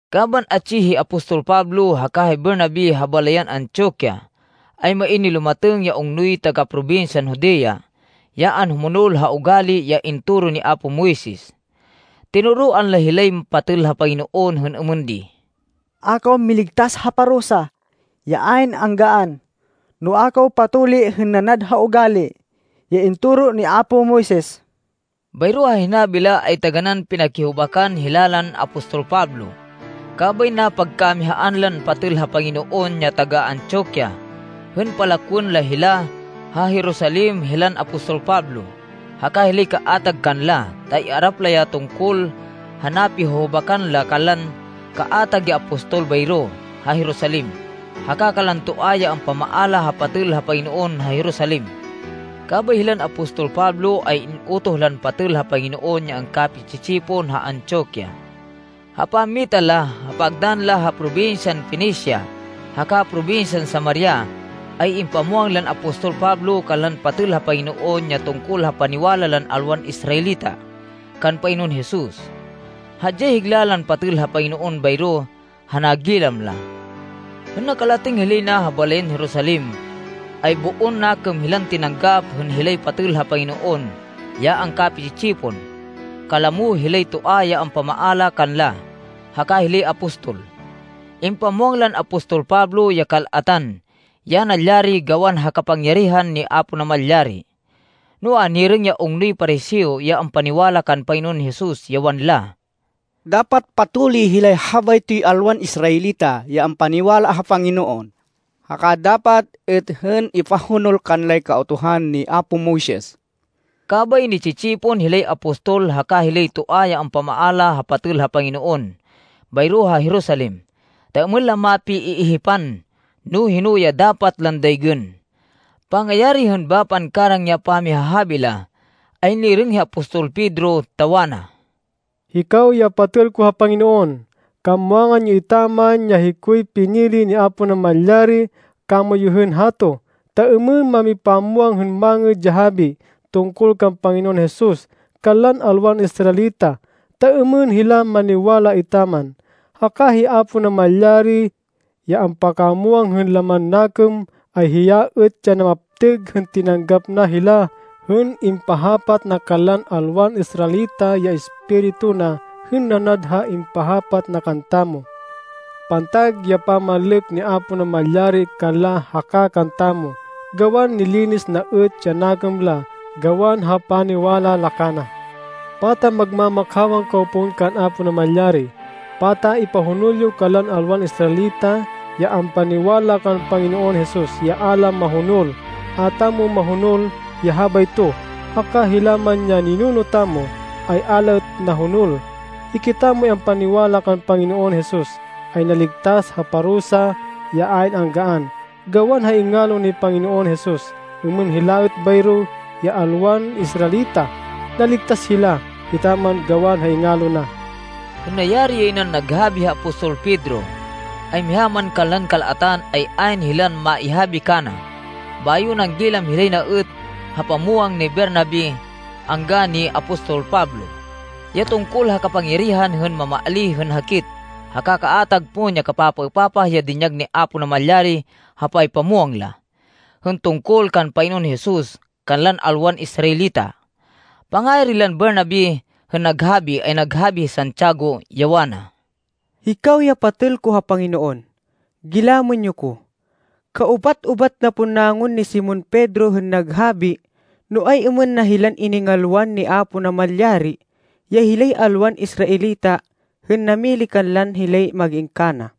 Kaban atsi hi apostol Pablo haka hi Bernabe ha balayan Antioquia, ay main nilumatêng ya ungnoy taga-probinsyan Judea, ya anhumonol ha ugali ya intoro ni apo Moises. Tinoroan la hilay patêl ha Panginoon hên êmên di, “A kaw miligtas ha parusa ya ayn anggaan, no a kaw patuli hên nanad ha ugali ya intoro ni apo Moises.” Bayro ha hinabi la, ay taganán pinakihubakan hila lan apostol Pablo. Kabay napagkamihaan lan patêl ha Panginoon ya taga-Antioquia hên palakwên la hila ha Jerusalem hilan apostol Pablo, haka hilay kaatag kanla, ta iarap la ya tungkol ha napihuhubakan la kanlan kaatag ya apostol bayro ha Jerusalem, haka kanlan toa ya ampamaala ha patêl ha Panginoon ha Jerusalem. Kabay hilan apostol Pablo ay in-utoh lan patêl ha Panginoon ya angkapi-tsi-tsipon ha Antioquia. Ha pammita la, ha pagdann la ha probinsyan Fenicia haka probinsyan Samaria, ay impamwang lan apostol Pablo kanlan patêl ha Panginoon ya tungkol ha paniwala lan alwan Israelita kan Panginoon Jesus. Hadyay higla lan patêl ha Panginoon bayro ha nagilam la. Hên nakalatêng hilay na ha balayan Jerusalem, ay boon nakêm hilan tinanggap hên hilay patêl ha Panginoon ya angkapi-tsi-tsipon, kalamo hilay toa ya ampamaala kanla, haka hilay apostol. Impamwang lan apostol Pablo ya kal-atan ya nalyari gawan ha kapangyarihan ni Apo Namalyari. Noa, nirêng ya ungnoy Pariseo ya ampaniwala kan Panginoon Jesus, ya wanla, “Dapat patuli hilay habaytoy alwan Israelita ya ampaniwala ha Panginoon, haka dapat êt hên ipahonol kanlay Kautuhan ni apo Moises.” Kabay, ni-tsi-tsipon hilay apostol haka hilay toa ya ampamaala ha patêl ha Panginoon bayro ha Jerusalem, ta êmên la mapi-iihipan no hino ya dapat lan daygên. Pangayari hên bapan karang ya pamihahabi la, ay nirêng hi apostol Pedro, ta wana, “Hikaw ya patêl ko ha Panginoon, kamwangan yo etaman, ya hikoy pinili ni Apo Namalyari kamoyu hên hato, ta êmên mamipamwang hên Mangêd ya Habi tungkol kan Panginoon Jesus, kanlan alwan Israelita, ta êmên hila maniwala etaman. Haka hi Apo Namalyari, ya ampakamwang hên laman nakêm, ay hiya êt ya namaptêg hên tinanggap na hila hên impahapat na kanlan alwan Israelita ya Espiritu na hên nanad ha impahapat na kantamo. Pantag ya pamanlêk ni Apo Namalyari kanla haka kantamo gawan nilinis na êt ya nakêm la gawan ha paniwala la kana. Pata magma-makhawan kaw pon kan Apo Namalyari! Pata ipahonol yo kanlan alwan Israelita ya ampaniwala kan Panginoon Jesus ya a la mahonol. A tamo mahonol ya habayto, haka hila man ya ninuno tamo ay a la êt nahonol! Hikitamoy ampaniwala kan Panginoon Jesus, ay naligtas ha parusa ya ayn anggaan gawan ha ingalo ni Panginoon Jesus, êmên hila êt bayro ya alwan Israelita. Naligtas hila etaman gawan ha ingalo na.” Hên nayari yay nan naghabi hi apostol Pedro, ay miha man kanlan kal-atan, ay ayn hilan maihabi kana. Bayo nanggilam hilay na êt ha pamwang ni Bernabe angga ni apostol Pablo, ya tungkol ha kapangyarihan hên mamaalíh hên hakit, haka kaatag pon ya kapapaêpapah ya dinyag ni Apo Namalyari ha paypamwang la, hên tungkol kan Panginoon Jesus kanlan alwan Israelita. Pangayari lan Bernabe hên naghabi, ay naghabi hi Santiago, ya wana, “Hikaw ya patêl ko ha Panginoon, gilamên yo ko. Kaubat-ubat na pon nangun ni Simon Pedro hên naghabi no ay-êmên na hilan iningalwan ni Apo Namalyari ya hilay alwan Israelita hên namili kanla hên hilay mag-in kana.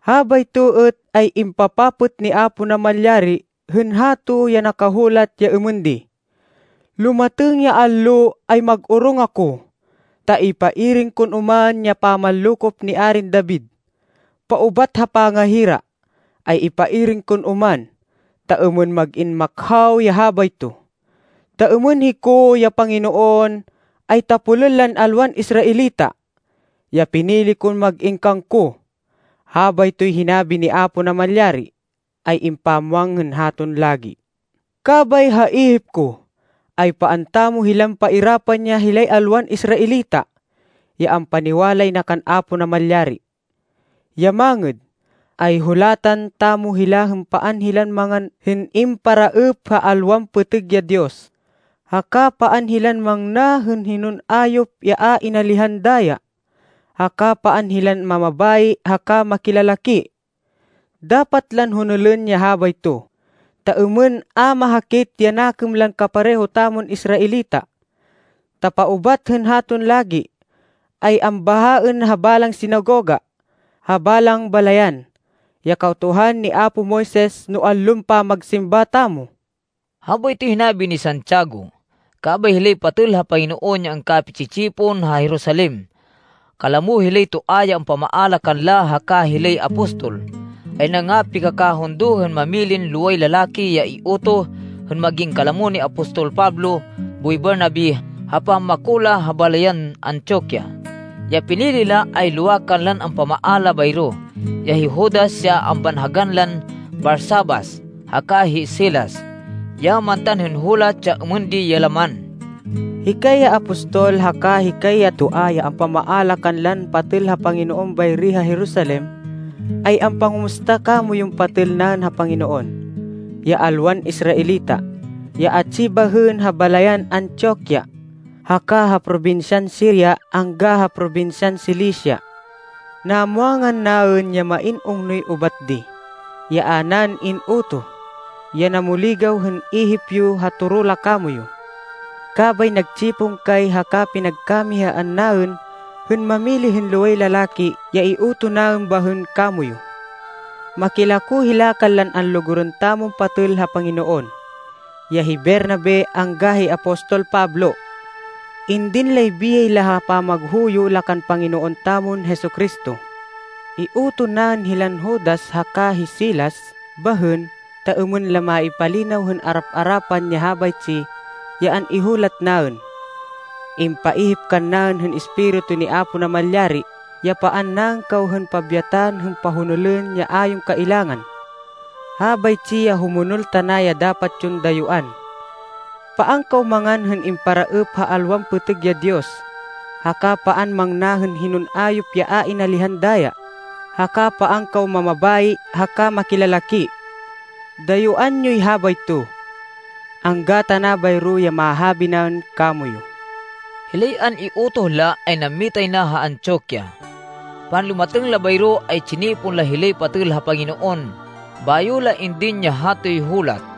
Habayto êt ay impapapêt ni Apo Namalyari hên hato ya nakahulat ya êmên di, ‘Lumatêng ya allo ay mag-orong ako, ta ipairêng kon oman ya pamanlokop ni Arin David. Paubat ha pangahira, ay ipairêng kon oman, ta êmên mag-in makhaw ya habayto. Ta êmên hiko, ya Panginoon, ay tapolên lan alwan Israelita, ya pinili ko hên mag-in kangko. Habaytoy hinabi ni Apo Namalyari, ay impamwang hên haton lagi.’ “Kabay ha ihip ko, ay paan tamo hilan pairapan ya hilay alwan Israelita, ya ampaniwalay na kan Apo Namalyari. Ya mangêd, ay hulatan tamo hila hên paan hilan mangan hên imparaêp ha alwan pêtêg ya diyos, haka paan hilan mangna hên hinon ayop ya a inalihan daya, haka paan hilan mamabayi haka makilalaki. Dapat lan honolên ya habayto, ta êmên a mahakit ya nakêm lan kapareho tamon Israelita, ta paubat hên haton lagi, ay ambahaên ha balang sinagoga, ha balang balayan, ya Kautuhan ni apo Moises no allon pamagsimba tamo.” Habaytoy hinabi ni Santiago. Kabay hilay patêl ha Panginoon ya angkapi-tsi-tsipon ha Jerusalem, kalamo hilay toa ya ampamaala kanla haka hilay apostol, ay nangapikakahundo hên mamilin loway lalaki ya iutoh hên mag-in kalamo ni apostol Pablo boy Bernabe ha pammako la ha balayan Antioquia. Ya pinili la, ay lowa kanlan ampamaala bayro, ya hi Judas ya ambanhagan lan Barsabas haka hi Silas, ya mantan hên hulat ya êmên di ya laman: “Hikay ya apostol haka hikay ya toa ya ampamaala kanlan patêl ha Panginoon bayri ha Jerusalem, ay ampangumusta kamoyun patêl naên ha Panginoon, ya alwan Israelita, ya atsi bahên ha balayan Antioquia, haka ha probinsyan Siria angga ha probinsyan Cilicia. Namwangan naên ya main ungnoy ubat di, ya a naên in-utoh, ya namuligaw hên ihip yo ha toro la kamoyu. Kabay nagtsipon kay haka pinagkamihaan naên hên mamili hên loway lalaki ya iutoh naên bahên kamoyu. Makilako hila kanlan anlugurên tamon patêl ha Panginoon, ya hi Bernabe angga hi apostol Pablo. Indin lay biyay la ha pamaghuyo la kan Panginoon tamon Jesu-Cristo. Iutoh naên hilan Judas haka hi Silas bahên ta êmên la maipalinaw hên arap-arapan ya habaytsi ya an-ihulat naên. Impaihip kannaên hên Espiritu ni Apo Namalyari ya paan naên kaw hên pabyatan hên pahonolên ya a yon kailangan. Habaytsi ya humonol tana ya dapat yon dayuán. Paan kaw mangan hên imparaêp ha alwan pêtêg ya diyos, haka paan mangna hên hinon ayop ya a inalihan daya, haka paan kaw mamabayi haka makilalaki. Dayuán yoy habayto. Angga tana bayro ya mahabi naên kamoyu.” Hilay an-iutoh la ay nammitay na ha Antioquia. Panlumatêng la bayro ay tsinipon la hilay patêl ha Panginoon bayo la indin ya hatoy hulat.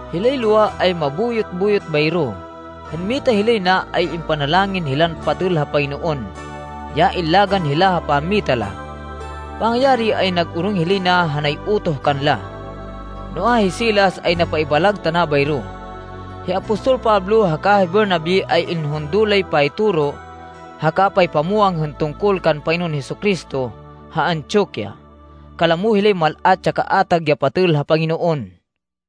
Hilay lowa ay mabuyot-buyot bayro. Hên mita hilay na ay impanalangin hila lan patêl ha Panginoon, ya illagan hila ha pammita la. Pangayari, ay nag-orong hilay na ha nay-utoh kanla. [Noa, hi Silas ay napaibalag tana bayro.] Hi apostol Pablo haka hi Bernabe ay inhundo lay paytoro haka paypamwang hên tungkol kan Panginoon Jesu-Cristo ha Antioquia, kalamo hilay mal-at ya kaatag ya patêl ha Panginoon.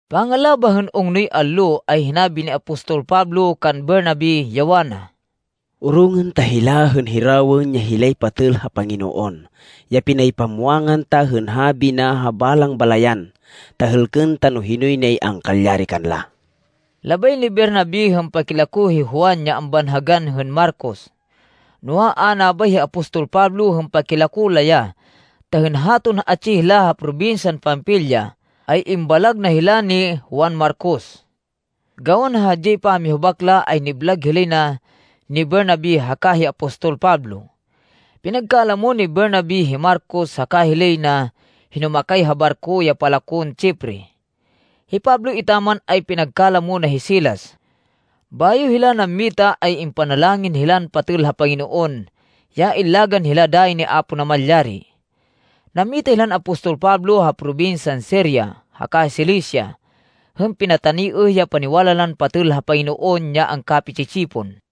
Pangalabah hên ungnoy allo, ay hinabi ni apostol Pablo kan Bernabe, ya wana, “Orongên ta hila hên hirawên ya hilay patêl ha Panginoon, ya pinaypamwangan ta hên habi na ha balang balayan, ta hêlkên ta no hinoy nay angkalyari kanla.” Labay ni Bernabe hên pakilako hi Juan ya ambanhagan hên Marcos. Noa, a nabay hi apostol Pablo hên pakilako la ya ta hên haton atsi hila ha probinsyan Panfilia ay imbalag na hila ni Juan Marcos. Gawan ha hadyay pamihubak la ay niblag hilay na ni Bernabe haka hi apostol Pablo. Pinagkalamo ni Bernabe hi Marcos haka hilay na hinumakay ha barko ya palakon Chipre. Hi Pablo etaman ay pinagkalamo na hi Silas. Bayo hila nammita ay impanalangin hila lan patêl ha Panginoon ya illagan hila dayi ni Apo Namalyari. Nammita hilan apostol Pablo ha probinsyan Siria haka Cilicia hên pinataniêh ya paniwala lan patêl ha Panginoon ya angkapi-tsi-tsipon.